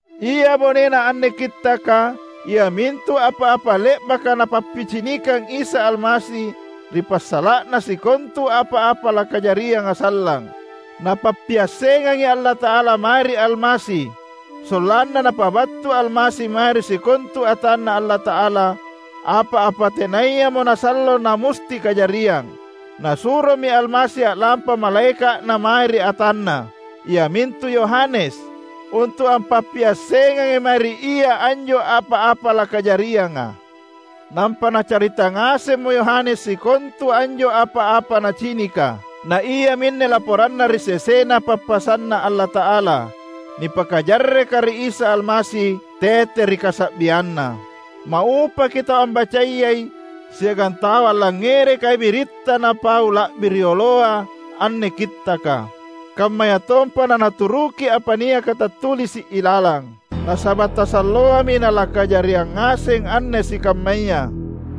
Ia bonena anne Kittaka, iamintu apa-apa le’baka Napappicinikang Isa Almasi ri passala’na sikontu apa-apa lakajarianga sallang. Napappiassengangi Allata’ala mae ri Almasi sollanna Napabattu Almasi mae ri sikontu atanNa Allata’ala apa-apa tenayamo nasallo namusti kajariang. Nasuromi Almasi a’lampa malaeka’Na mae ri atanNa, iamintu Yohanes, untu’ ampappiassengangi mae ri ia anjo apa-apa lakajarianga. Nampa nacarita ngasemmo Yohanes sikontu anjo apa-apa nacinika; na iaminne laporanna ri sesena pappasanNa Allata’ala, nipakajarreka ri Isa Almasi tete ri kasa’bianNa. Maupaki tau ambacayai siagang tau allangngerekai biritta napau la’bi rioloa anne kittaka, kammayatompa nanaturuki apa niaka tattulisi’ ilalang. Nasaba’ tasalloami nalakajariang ngaseng anne sikammaya.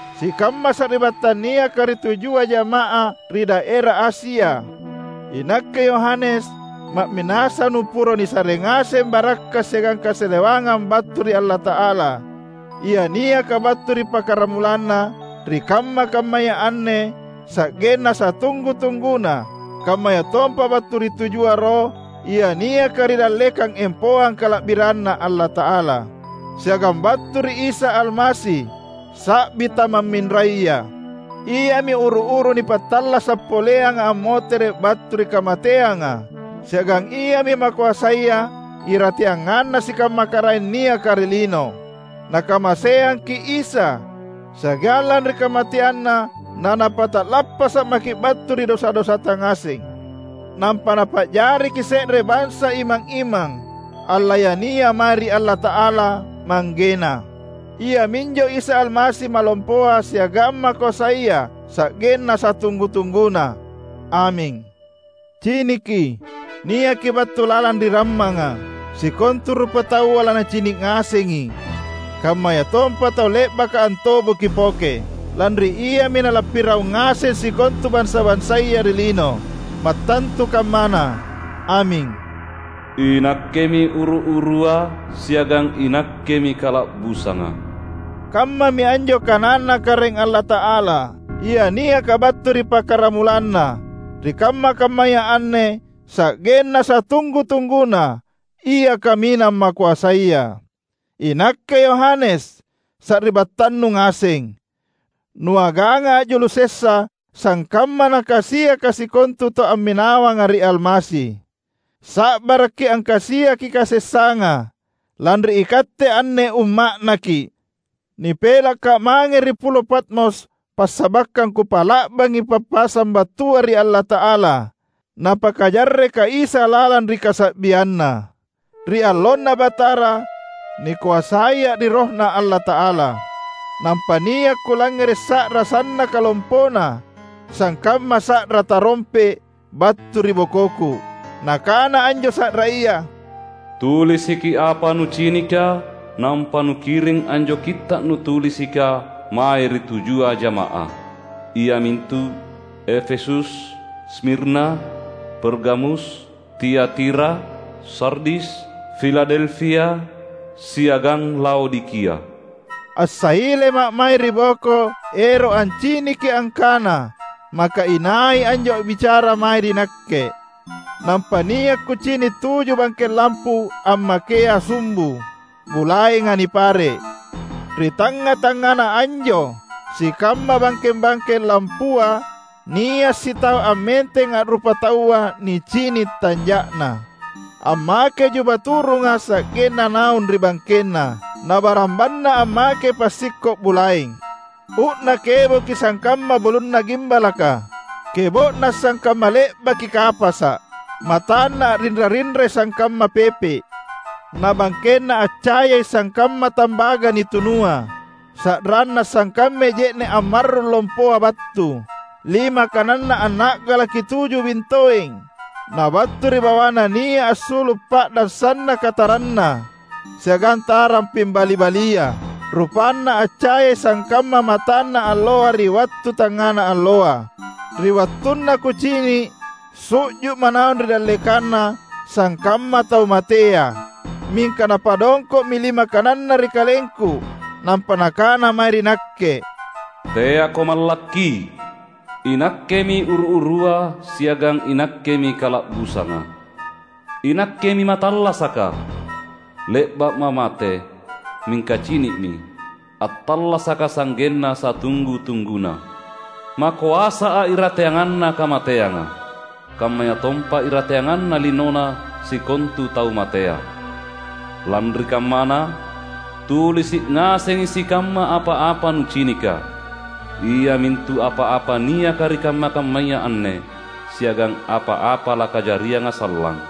Sikamma sari’battang niaka ri tujua jama’ah ri daera Asia! Inakke, Yohanes, ma’minasa’ nuporo nisare ngaseng barakka’ siagang kasalewangang battu ri Allata’ala, Ia niaka battu ri pakaramulanna, ri kamma-kammaya anne, sa’genna satunggu-tungguna; kammayatompa battu ri tujua roh ia niaka ri dallekang empoang kala’biranNa Allata’ala, siagang battu ri Isa Almasi, sa’bi tamamminraya. Iami uru-uru nipattallasa’ poleanga ammotere’ battu ri kamateanga siagang Iami makoasaya irateanganna sikamma karaeng niaka ri lino. Nakamaseangki’ Isa, siagang lanri kamateanNa naNapata’lappasa’ maki’ battu ri dosa-dosata ngaseng. Nampa Napa’jariki’ se’re bansa imang-imang, allayania mae ri Allata’ala, ManggeNa. Iaminjo Isa Almasi malompoa siagang makoasaya sa’genna satunggu-tungguna. Aming! Ciniki, niakI battu lalang ri rammanga! Sikontu rupataua lanacini’ ngasengI, kammayatompa tau le’baka antobokI poke. Lanri Iami nalappiraung ngaseng sikontu bansa-bansaya ri lino. Mattantu kammana! Aming! "INakkemi uru-urua, siagang iNakkemi kala’busanga," kammami anjo kananNa Karaeng Allata’ala, Ia niaka battu ri pakaramulanna, ri kamma-kammaya anne, sa’genna satunggu-tungguna, Ia Kaminang Makoasaya. Inakke Yohanes, sari’battannu ngaseng, nuaganga’ a’julu sessa sangkamma nakasiaka sikontu tau amminawanga ri Almasi. Sa’barakki’ angkasiaki kasessanga, lanri ikatte anne umma’Naki’. Nipelakka’ mange ri Pulo Patmos passabakkang kupa’la’bangi pappasang battua ri Allata’ala, Napakajarreka Isa lalang ri kasa’bianNa. Ri allonNa Batara, nikoasaia’ ri RohNa Allata’ala; nampa nia’ kulangngere’ sa’ra sannaka lompona, sangkamma sa’ra tarompe’, battu ri bokoku. Nakana anjo sa’raya, "Tulisiki apa nucinika, nampa nukiring anjo kitta’ nutulisika mae ri tujua jama’ah, iamintu: Efesus, Smirna, Pergamus, Tiatira, Sardis, Filadelfia, siagang Laodikia." Assailema’ mae ri boko ero’ anciniki angkana maka inai anjo a’bicara mae ri nakke. Nampa nia’ kucini’ tuju bangkeng lampu ammakea sumbu, bulaenga nipare’. Ri tangnga-tangngana anjo sikamma bangkeng-bangkeng lampua nia’ sitau ammenteng a’rupa taua nicini’ tanja’Na. Ammakei juba turunga sa’genna naung ri bangkenNa. Na barambanNa ammakei passikko’ bulaeng. Uu’Na keboki sangkamma bulunna gimbalaka, kebo’Na sangkamma le’baki kapasa’. MatanNa a’rinra-rinrai sangkamma pepe’; na bangkenNa accayai sangkamma tambaga nitunua. Sa’ranNa sangkammai je’ne’ ammarrung lompoa battu. Lima kananNa anna’galaki tuju bintoeng, na battu ri bawaNa nia’ assulu’ pa’dang sannaka taranna, siagang tarang pimbali-balia. RupanNa accayai sangkamma matanna alloa ri wattu tangngana alloa. Ri wattunna kucini’, su’ju’ma’ naung ri dallekanNa sangkamma tau matea. Mingka Napadongko’mi lima kananNa ri kalengku nampa Nakana mae ri nakke, "Teako mallakki! INakkemi uru-urua siagang iNakkemi kala’busanga. INakkemi mattallasaka! Le’ba’Ma’ mate, mingka cini’mi, attallasaKa’ sa’genna satunggu-tungguna. MakoasA’ irateanganna kamateanga, kammayatompa irateanganna linona sikontu tau matea. Lanri kammana, tulisi’ ngasengi sikamma apa-apa nucinika, iamintu apa-apa niaka ri kamma-kammaya anne, siagang apa-apa lakajarianga sallang.